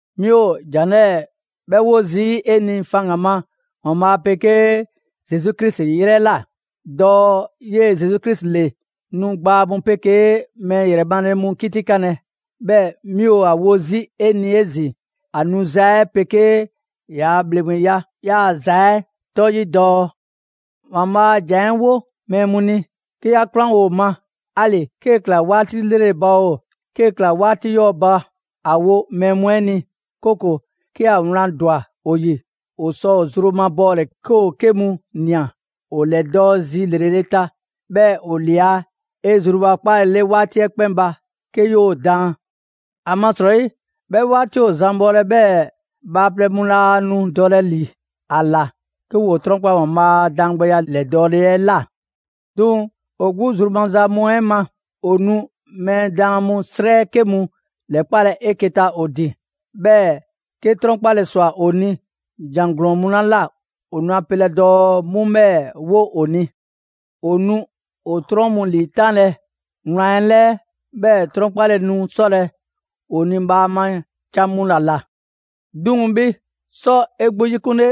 'Mi ‑o ‑jan 'lɛɛ‑ 'bhɛ 'wo zii' 'e ni faŋgan‑ ma ‑Waanbhaa' 'pegee Zesu Krisi 'yrɛ ꞊la, dɔɔ 'yee‑ Zesu Krisi ‑le nu gbaa mu 'pegee mɛɛ ‑yrɛ male mu 'kitikanlɛ. 'Bhɛɛ‑ 'mi ‑a wo 'zi 'e ni 'ezin‑ ‑a 'nuza‑ 'ɛ 'pegee ‑yaa' ‑bhleŋgbeya yaaza 'ɛ 'tɔ 'yi, dɔɔ: ‑Waanbhaa' a ‑Jan 'ɛ 'wo mɛɛ mu ni, 'ke 'ya 'kwlanwo‑ ‑o ma, 'ali‑ 'kee‑ ‑kla 'waati 'lrele‑ ba oo, 'kee‑ ‑kla 'waati 'yɔɔ‑ ba. ‑A wo mɛɛ mu 'ɛ ni, 'kooko‑ 'ke ‑a wlan ‑dwa ‑o ‑yi, ‑o sɔ ‑o zru mabɔɔle, 'ke ‑o 'ke mu ꞊nia, ‑o ‑lɛdɔɔ' zi ‑lrele' ta, 'bhɛɛ‑ ‑o ‑lia 'e zrubakpaalele 'waati 'ɛ 'kpɛn ba 'ke 'yoo‑ daan. ‑Amasrɔyi 'bhɛ 'waati ‑o zan bhɔlɛ 'bhɛɛ‑ bhaaplɛŋ mu laa nu dɔlɛ ‑li ‑a ‑la 'ke ‑woo 'trɔnkpa‑ ‑Waanbhaa' a daangbɛya 'lɛdɔɔle 'ɛ ꞊la. 'Duŋ‑ ‑o 'gbu zru maza mu 'ɛ ma, ‑o nu mɛɛ daan mu 'srɛ 'ke mu ‑lɛkpalɛ 'eke‑ ta ‑o ‑din; 'bhɛɛ‑ 'ke 'trɔnkpale ‑swa ‑o ni ‑jan ‑glɔɔn mu 'la ꞊la, ‑o nu a pelɛ dɔɔ 'mu 'bhɛɛ‑ 'wo ‑o ni. ‑O nu ‑o 'trɔn mu ‑liitanlɛ wlan 'ɛ 'lɛɛ; 'bhɛɛ‑ 'trɔnkpale nu 'sɔlɛ‑ ‑o ni bhaama can mu ‑la ꞊la. 'Duŋ‑ 'bhi, 'sɔ 'e 'gbu 'yikunle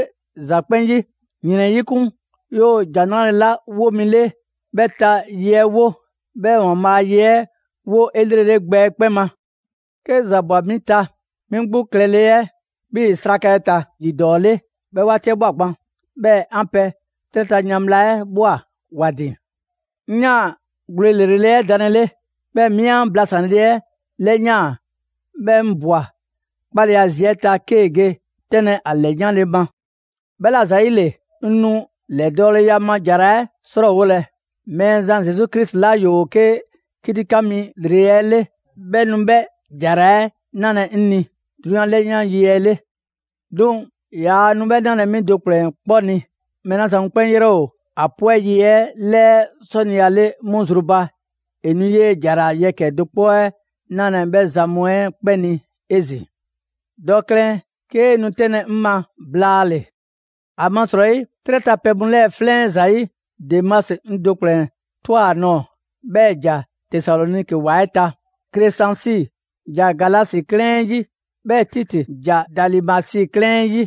‑za 'kpɛn 'yi, ‑yrɛn 'yikun, 'yoo‑ ‑Jan 'Nrale‑ 'la 'wo mi 'le, 'bhɛ ta ye 'ɛ 'wo. 'Bhɛɛ‑ ‑Waanbhaa' a ye 'ɛ 'wo 'elrele gbɛ 'ɛ 'kpɛn ma. 'Ke ‑za ꞊bwa 'mi ta, 'mi 'gbu klɛle 'ɛ 'bhii‑ 'sraka 'ɛ ta ‑yi ‑dɔɔ 'le 'bhɛ 'waati 'ɛ ꞊bhwa gban; 'bhɛɛ‑ 'an pɛ 'trɛ ta yan bhla 'ɛ ꞊bhwa ‑wa ‑din. 'Ŋ 'yaan‑ gwle ‑lrele' 'ɛ danlele, 'bhɛɛ‑ 'mi an blasanle 'ɛ 'lɛyaan‑; 'bhɛɛ‑ 'ŋ ꞊bwa 'kpaleya zi 'ɛ ta 'kee‑ ge 'tɛnlɛ‑ ‑a ‑lɛyanle ma. 'Bhɛla‑ ‑zayile, 'ŋ nu ‑lɛdɔɔleya ma ‑jara 'ɛ 'srɔɔwolɛ. Mɛɛzan Zesu Krisi 'la ‑yoo 'ke 'kitikan mi ‑lrele' 'ɛ 'le, 'bhɛ nu 'bhɛ ‑jara 'ɛ 'nalɛ‑ 'ŋ ni 'drunyan 'lɛyan yi 'ɛ 'le. 'Duŋ‑ yaa nu 'bhɛ 'nalɛ‑ 'mi do ‑kplɛn 'kpɔ ni; mɛɛ 'la zan mu 'kpɛn 'yrɛ ‑o ‑a 'pwɛ 'yi 'ɛ 'lɛɛ 'sɔniya 'le 'mu zru ba, ‑e nu 'yee‑ ‑jara yɛkɛ‑ do 'kpɔ 'ɛ 'nalɛ‑ 'bhɛ zan mu 'ɛ 'kpɛn ni 'ezin‑. Dɔ klɛn 'kee nu 'tɛnlɛ‑ 'ŋ ma blaale‑. ‑Amasrɔyi, 'trɛ ta pɛ mu 'lɛɛ 'flɛn 'ɛ ‑zayi', Demasi 'ŋ do ‑kplɛn ꞊twa ‑a nɔɔ‑, 'bhɛɛ‑ ‑e ‑ja Tesaloniki ‑wa 'ɛ ta. Kresansi ‑ja Galasi 'klɛɛn 'ɛ 'yi, 'bhɛɛ‑ Titi ‑ja Dalimasi 'klɛɛn 'ɛ 'yi.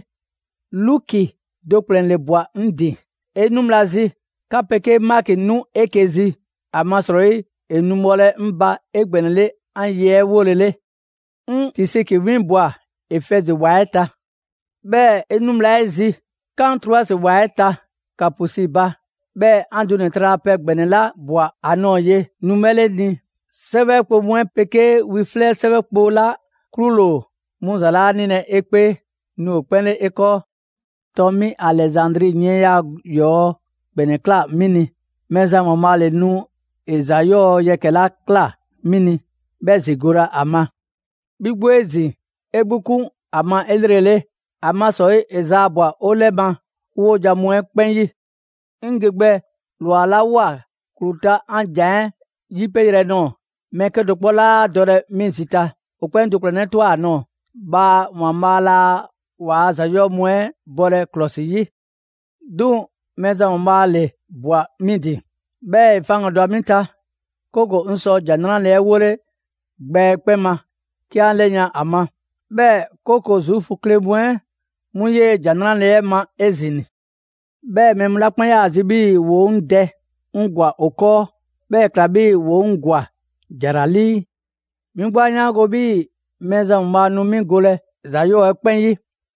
Luki do ‑kplɛn ‑le ꞊bwa 'ŋ ‑din. 'E 'nu bhla zi, 'ka 'pegee Maki 'nu 'eke‑ zi; ‑amasrɔyi ‑e nu bhɔlɛ 'ŋ ba 'egbɛnɛle 'an ye 'ɛ 'wolele. 'Ŋ Tisiki 'winbwa‑ Efɛzi ‑wa 'ɛ ta. 'Bhɛɛ‑ 'e 'nu bhla 'ɛ zi, 'kan Troasi ‑wa 'ɛ ta Kaapusi ba; 'bhɛɛ‑ 'an dunɛ‑ tralapɛ ‑gbɛnɛ 'la ꞊bwa ‑a nɔɔ‑ ye nu 'bhɛ 'le 'ŋ ni. 'Sɛwɛ kpo mu 'ɛ 'pegee wi 'flɛ 'sɛwɛ kpo 'la 'klule‑ ‑o 'mu ‑za 'laa 'nilɛ‑ 'e 'kpee, nu ‑o 'kpɛn 'le 'e 'kɔɔ. ‑Tɔn mi Alɛzandri yiɛnya 'yɔɔ‑ ‑gbɛnɛ ‑kla 'mi ni. Mɛɛzan ‑Waanbhaa' ‑le nu ‑e ‑za 'yɔɔ‑ yɛkɛ‑ 'la ꞊kla 'mi ni, 'bhɛ zigolɛ ‑a ma. 'Bhi 'gbu 'ezin‑, 'e 'gbu 'klɔsikun ‑a ma 'elrele, ‑amasrɔyi ‑e ‑zaabwa 'o 'lɛ ma 'o 'wojan‑ mu 'ɛ 'kpɛn 'yi. 'Ŋ ge gbɛ ‑lwa 'la ꞊woa ‑klu ta 'an ‑za 'ɛ 'yipe yrɛ nɔɔ‑, mɛɛ 'kedo‑ 'kpɔ 'laa dɔlɛ 'mi zi ta; ‑o 'kpɛn 'ŋ do ‑kplɛnnɛ' ꞊twa ‑a nɔɔ‑. Bhaa ‑Waanbhaa' laa ‑waa' ‑za 'yɔɔ‑ mu 'ɛ bɔlɛ ‑klɔsi 'yi. 'Duŋ‑ Mɛɛzan ‑Waanbhaa' ‑le ꞊bhwa 'mi ba, 'bhɛɛ‑ ‑e faŋgandwa 'mi ta; 'kooko‑ 'ŋ sɔ ‑Jan 'Nrale‑ 'ɛ 'wole gbɛ 'ɛ 'kpɛn ma 'ke 'an ‑lɛyan' ‑a ma. 'Bhɛɛ‑ 'kooko‑ Zuufu kle mu 'ɛ 'mu 'yee‑ ‑Jan 'Nrale‑ 'ɛ ma 'ezin‑. 'Bhɛɛ‑ mɛɛ mu 'la 'kpɛn 'yaa‑ zi 'bhii‑ ‑woo 'ŋ dɛ, 'ŋ ‑gwa ‑o 'kɔɔ; 'bhɛɛ‑ ‑e ‑kla 'bhii‑ ‑woo 'ŋ ‑gwa ‑jara 'lii. 'Mi 'gbu 'a 'yaango‑ 'bhii‑ Mɛɛzan ‑Waanbhaa' nu 'mi golɛ ‑za 'yɔɔ‑ 'ɛ 'kpɛn 'yi,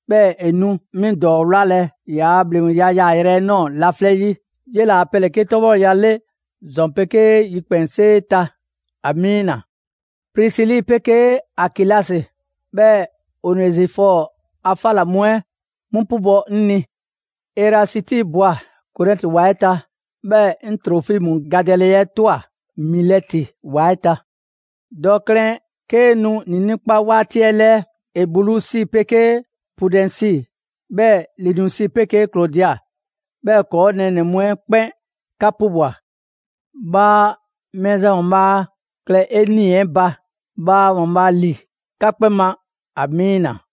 'bhɛɛ‑ ‑e nu 'mi ‑dɔɔ 'wlalɛ‑ ‑yaa' ‑bhleŋgbeya yaayrɛ 'ɛ ꞊nɔɔ laflɛ' 'yi. 'Yela‑ ‑a pɛ ‑le 'ke 'tɔbhɔleya 'le ‑zɔn 'pegee yikpɛnsee ta! Amiina. Prisili 'pegee Akilasi, 'bhɛɛ‑ Onezifɔɔ a 'fa ‑la mu 'ɛ 'mu 'pubɔ‑ 'ŋ ni. Erasiti ꞊bwa Korɛnti ‑wa 'ɛ ta, 'bhɛɛ‑ 'ŋ Trofimu gadɛle 'ɛ ꞊twa Milɛti ‑wa 'ɛ ta. Dɔ klɛn 'kee nu ‑niinii' 'kpa 'waati 'ɛ 'lɛɛ. Ebulusi 'pegee Pudɛnsi, 'bhɛɛ‑ Linusi 'pegee Klodia, 'bhɛɛ‑ ‑kɔɔ' nɛɛnɛ‑ mu 'ɛ 'kpɛn 'ka 'pubwa‑. Bhaa Mɛɛzan ‑Waanbhaa' klɛ 'e 'nii‑ 'ɛ ba. Bhaa ‑Waanbhaa' ‑li 'ka 'kpɛn ma! Amiina.